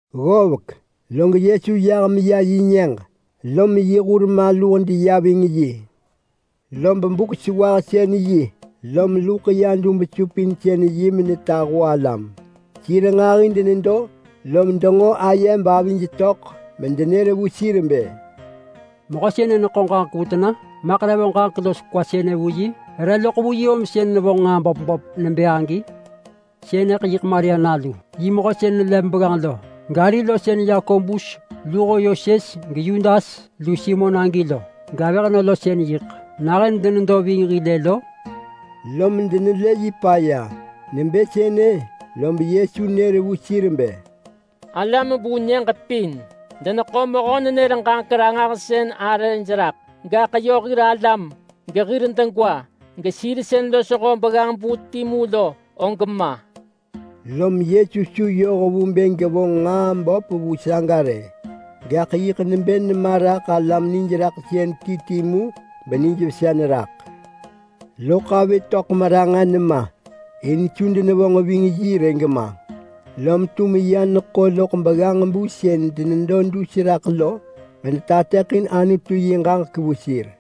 Ggovek log Yesu yah meya yi nyëġ, lom yi hur maluh deya ving yi. Lob Buk-sewahsën-yi lom luḳ ya dub-supinsën-yi menetahu alam. Sir nġahi denedo, lom denġo aye bavij töḳ medenër vu sir nebë, “Mehö sënë neḳo ġaġek sënë vu tena? Maḳ re vonġ ġaġek los kwa sënë vu yi? Re loḳ vu yi om sën nevonġ nġaa böp böp nebë agi? Sënëḳ yiḳ Maria nalu, mehö sën nelev begganġ lo? Gari lo sën Yakobus luho Yoses geYudas lu Simon agi lo? Gavëhnö lo sën yiḳ nahën denedo ving hil-ë lo?” Lom denelë yi paya. Nebë sënë lob Yesu nër vu sir bë, “Alam vu nyëġ pin deneḳo mehö-nenër-ġaġek-ranġahsën arëj raḳ, gaḳ yö hir alam, gehir degwa, gesir sën losho begganġ-bu timu lo, og ma!” Lom Yesu su yoh vu bë gevonġ nġaa böp vu saga rë. Gaḳ yiḳ nebë nema raḳ alam nijraḳsën ti ti mu benijvesa neraḳ. Lob avi töḳ meranġa nema in su denevonġ ving yi rë gema. Lom ya neḳo loḳ begganġ-bu sën denedo dus raḳ lo metateḳin Anutu yi ġaġek vu sir.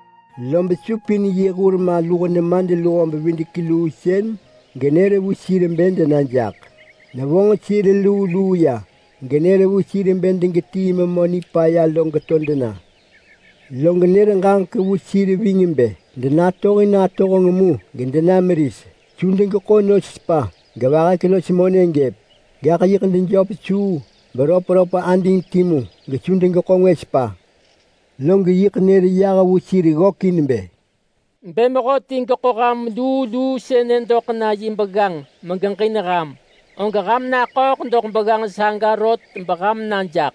Lob supin yi hur maluh nemadluho-bevidek-luu sën lo genër vu sir bë dena jaḳ. Nevonġ sir luu luu ya genër vu sir bë degetii memö nipaya lo geto dena. Lob nër ġaġek vu sir ving bë denatohin atohenġ mu gedena meris. Su degeḳo nos sepa, gevahek los monë gëp. Gaḳ yiḳ dejöp suu beröpröp ading timu gesu degeḳo ngwë sepa. Log yiḳ nër yah vu sir ggökin bë, “Bë mehöti geḳo ham luu luu sënë doḳ na yi begganġ megeġin ham, og ham naḳööḳ doḳ begganġ saga rot beham na jaḳ.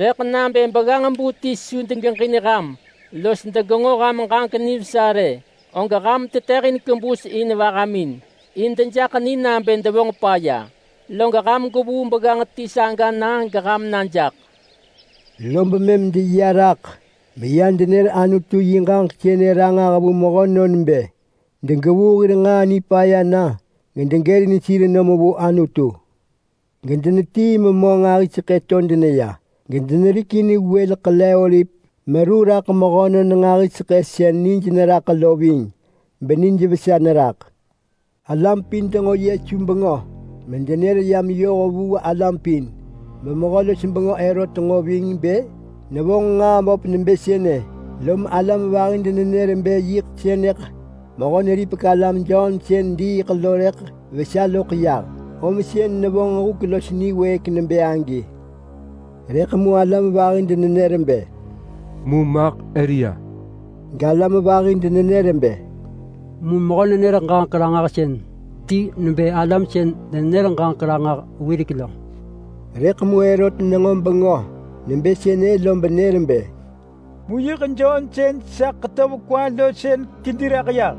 Rëḳ nabë begganġ-bu ti su degeġin ham los degenġo ham ġaġek nivesa rë, og ham tetëhin kebus in vahamin, in dejaḳ ni nabë devonġ paya, log ham gwevuu begganġ ti saga na geham na jaḳ. Lob mëm deya raḳ meya denër Anutu yi ġaġek sënë ranġah vu mehönon bë degevuu hir nġaa nipaya na gedegërin sir nom vu Anutu. Gedenetii memö nġahiseḳë to deneya, gedenerikin wël ḳele-oliv raḳ mehönon nġahiseḳë sën nij neraḳ lo ving, benijvesa neraḳ. Alam pin denġo Yesu bengö medenër ya meyoh vu alam pin, beMehö-los-bengö Herot nġo ving bë nevonġ nġaa böp nebë sënë, lom alam vahi denenër bë yiḳ sënëḳ Mehö-neripek-alam Jon sën diiḳ lo rëḳ vesa loḳ yah, om sën nevonġ huk los niwëëk nebë agi. Rëḳ mu alam vahi denenër bë, “Mu maḳ Elia.” Galam vahi denenër bë, “Mu mehö-nenër-ġaġek-ranġahsën ti nebë alam sën denenër ġaġek ranġah wirek lo.” Rëḳ mu Herot nenġo bengö nebë sënë lob nër bë, “Mu yiḳ Jon sën sa ḳetöv kwa lo sën kedi raḳ yah.”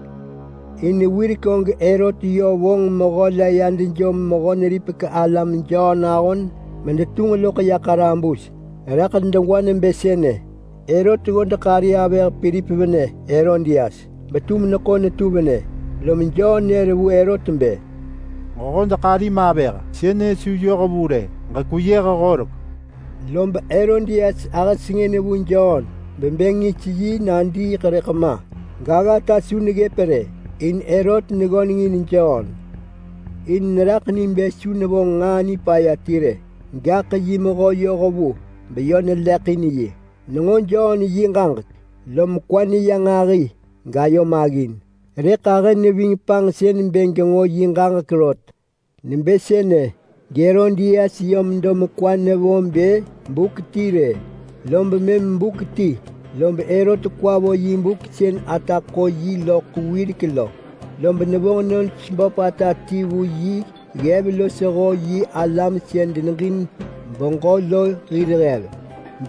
In wirek og Herot yö vonġ mehö la ya dejom Mehö-neripek-alam Jon ahon medetunġ loḳ ya ḳarabus raḳ degwa nebë sënë: Herot ggodeḳ ari Pilip venë Herodias, betum neḳo netu venë, lom Jon nër vu Herot bë, “Ġehodeḳ arim avëh, sënë su yoh vu rë, ġekweyëh horek!” Lob Herodias ahë sengën vu Jon bebë ngis yi nadiiḳ rëḳ ma, gaggata su neggëp rë, in Herot neggönengin Jon. In neraḳ ni bë su nevonġ nġaa nipaya ti rë, gaḳ yi mehö yohvu beyi vabuung, lom neġin yi nivesa. Nenġo Jon yi ġaġek lom kwa neya nġahi gayo maggin, rëḳ ahë neving panġsën bë genġo yi ġaġek rot. Nebë sënë geHerodias yö medo mekwa nevo bë buk ti rë. Lob mëm buk ti, lob Herot kwa vo yi buk sën ata ḳo yi wirek lo, lob nevonġ nos böpata ti vu yi ggev losho yi alam sën deneġin beġö lo hir ggev,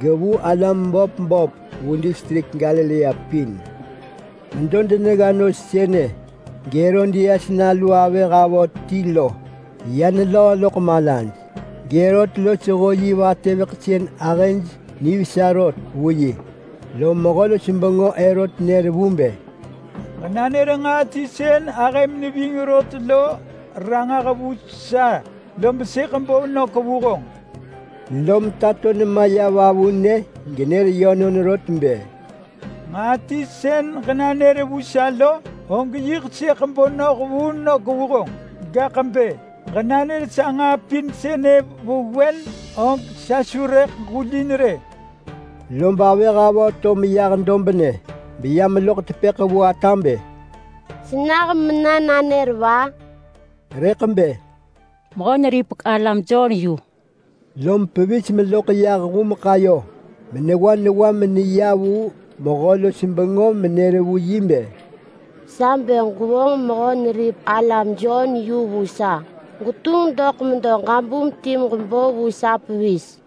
gevu alam böp böp vu distrik Galilea pin. Medo denegga nos sënë geHerodias nalu avëh avö ti lo ya nelöö loḳ malaj, geHerot losho yi vatëveḳ sën ahëj nivesa rot vu yi, lom Mehö-los-bengö Herot nër vu bë, “Ġenanër nġaa ti sën ahëm neving rot lo ranġah vu sa, lob sëḳ bo nök vu honġ.” Lom tato nema ya vavunë genër yönon rot bë, “Nġaa ti sën ġenanër vu sa lo, og yiḳ sëḳ bo noh vu nök vu honġ. Gaḳ bë ġenanër sa nġaa pin sënë vewen, og sa su rëḳ ġulin rë.” Lob avëh avö to meyah dobnë beya meloḳ tepëḳ vu ata bë, “Senah mena nanër va?” Rëḳ bë, “Mehö-neripek-alam Jon yu!” Lom pevis meloḳ yah humeḳ ayo menewa newa meneya vu mehö-los-bengö menër vu yi bë, “Sa bë gwevonġ Mehö-neripek-alam Jon yu vu sa! Gwetunġ doḳ medo ġabum ti meġebo vu sa pevis.”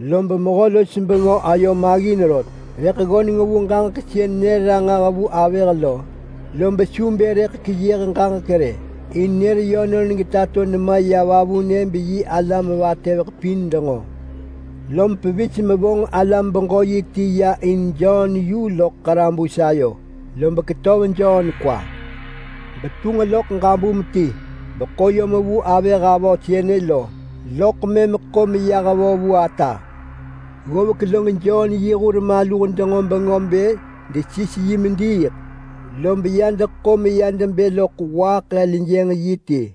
Lob mehö-los-bengö ayo maggin rot, rëḳ ggöneng vu ġaġek sën nër ranġah vu avëh lo, lob su bë rëḳ keyëh ġaġek rë in nër yönon getato nema ya vavunë, beyi alam vatëveḳ pin denġo. Lom pevis mevonġ alam-beġö-yi ti ya in Jon yu loḳ ḳarabus ayo. Lob ketöv Jon kwa, betunġ loḳ ġabum ti, beḳo yom vu avëh avö sënë lo, loḳ mëm ḳo meyah vo vu ata. Ggovek saga lob Jon yi hur maluh denġo bengö bë desis yi mediiḳ, lob ya deḳo meya debë loḳ waaḳ heljënġ yi ti.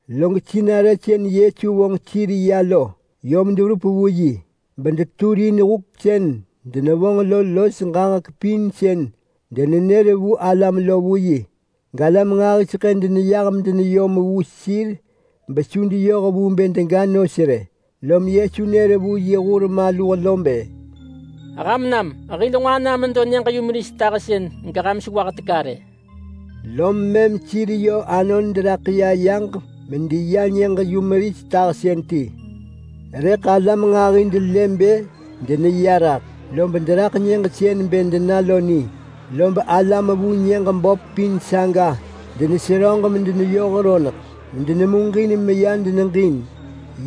Lob sinarë sën Yesu vonġ sir ya lo yom deverup vu yi, bedenër huk sën denevonġ lo los ġaġek pin sën denenër vu alam lo vu yi. Galam nġahiseḳë deneyah gedeneyom vu sir besu deyoh vu bë dega nos rë, lom Yesu nër vu yi hur maluh lo bë, “Ham nam hil nġo ana medo nyëġ-yumeris tahsën geham sewah teka rë!” Lom mëm sir yö anon deraḳ ya yaġ medeya nyëġ-yumeris tahsën ti. Rëḳ alam nġahi delë bë deneya raḳ, lob deraḳ nyëġ sën bë dena lo ni, lob alam vu nyëġ böp pin saga deneseröġ medeneyoh roneḳ medenemuġin meya deneġin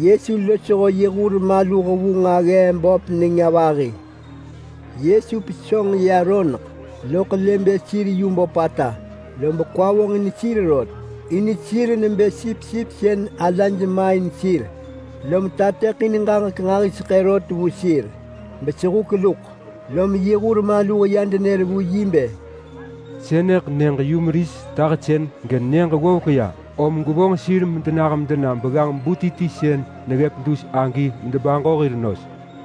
Yesu losho yi hur maluh vu nġaggee böp nenga vahi sagu. Yesu pesönġ ya roneḳ loḳ lë bë sir nġahiseḳë, lob kwa vonġin sir rot, in sir nebë sipsip sën alaj main sir, lom mëm tateḳin ġaġek nġahiseḳë vu sir rot, besehuk luḳ, lom yi hur maluh ya denër vu yi bë, “Sënëḳ nyëġ-yumeris tahsën sënë genyëġ ggovek ya, om gwevonġ sir medenah medena begganġ-bu ti ti sën neggëp dus agi medebaġo hir nos.”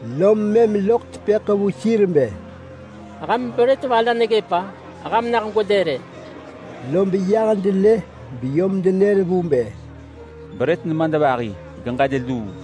Lom mëm loḳ tepëḳ vu sir bë, “Ham brët va la neggëp-a? Ham nah gwelë rë!” Lob yah delë beyom denër vu bë, “Brët nemadvahi, geġël luu!”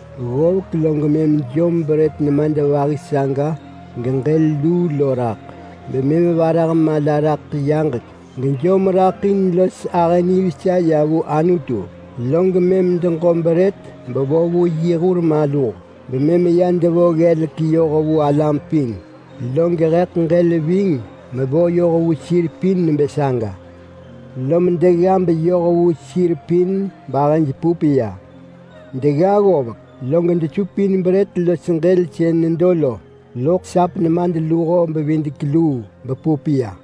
Ggovek ya, lob mëm nejom brët nemadvahi saga geġël luu lo raḳ, bemëm varah mala raḳ yaġek gejom raḳ in los ahë nivesa ya vu Anutu, log mëm deġo brët bevo vu yi hur maluh bemëm ya devo ggelek yoh vu alam pin. Lob heḳ ġël mevo yoh vu sir pin nebë saga ving. Lom degga beyoh vu sir pin bahëj pup ya. Degga ggovek, log desupin brët los ġël sën nedo lo loḳ sap nemadluho-bevidek-luu bepup ya.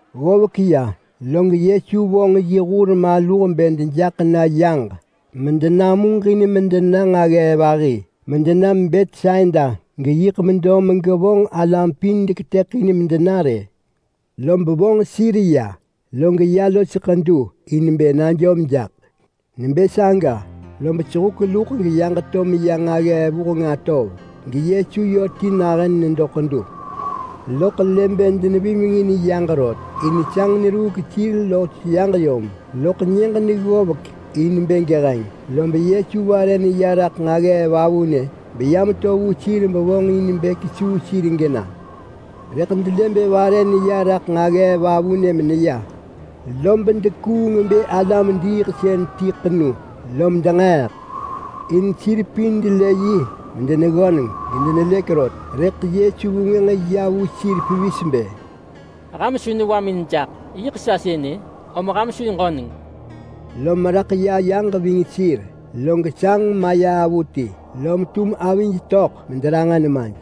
Ggovek ya log Yesu vonġ yi hur maluh bë dejaḳ na yaġ medenamuġin medena nġaggee vahi medena Betsaida, geyiḳ medo megevonġ alam pin sën deketëḳin medena rë. Lob vonġ sir ya, log ya los ḳedu in bë najom jaḳ. Nebë saga lob sehuk luḳ geyaġ to meya nġaggee vuheng atov geYesu yö ti nahën nedo ḳedu. Loḳ nelë bë denevimengin yaġ rot in sanġ neruuk sir los yaġ yom. Loḳ nyëġ neggovek in bë geheng, lob Yesu vare neya raḳ nġaggee vavunë beya meto vu sir bevonġ in bë kesuu sir gena. Rëḳ delë bë vare neya raḳ nġaggee vavunë meneya, lob dekuung bë alam-diiḳsën ḳenuj ti, lom denġeeḳ. In sir pin delë medeggönengin yi medelëk rot, rëḳ Yesu vengwënġ ya vu sir pevis bë, “Ham su newamin jaḳ! Yiḳ sa sënë, om ham su ġöneng!” Lom raḳ ya yaġ ving sir, log sanġ maya avuti, lom tum avij netöḳ mederanġa nemaj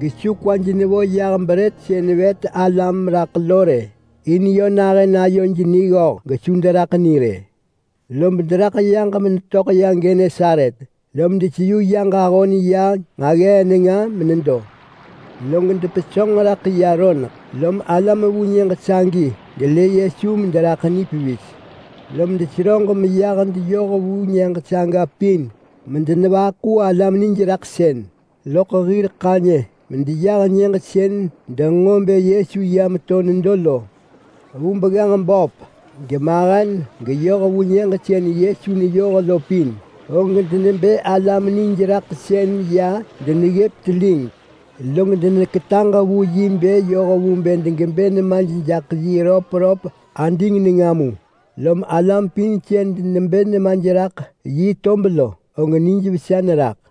in su kwaj nevo brët sën vet alam raḳ lo rë gema. In nahën gesu kwaj töḳ raḳ degwa rë. Lob deraḳ yaġ medetöḳ ya Genesaret, lom mëm deseyu yaġ ahon ya nġaggee nenga menedo. Log depesönġ mederaḳ ya roneḳ, lom alam vu nyëġ sagi delë Yesu mederaḳ ni pevis. Lom mëm deneseröġ medeneyoh vu nyëġ saga pin medenevaḳu alam nijraḳsën loḳ hir ḳanyë medeneya nyëġ sën denenġo bë Yesu ya meto nedo lo. Vu begganġ yu böp geyu mahen geyoh vu nyëġ sën Yesu neyoh lo pin, og denebë alam nijraḳsën ya deneggëp telig, log deneketaġ vu yi bë yoh vu bë degebë nemaj jaḳ yi röpröp ading nenga mu. Lom alam pin sënë sën denebë nemaj raḳ yi tob lo, og nijvesa neraḳ.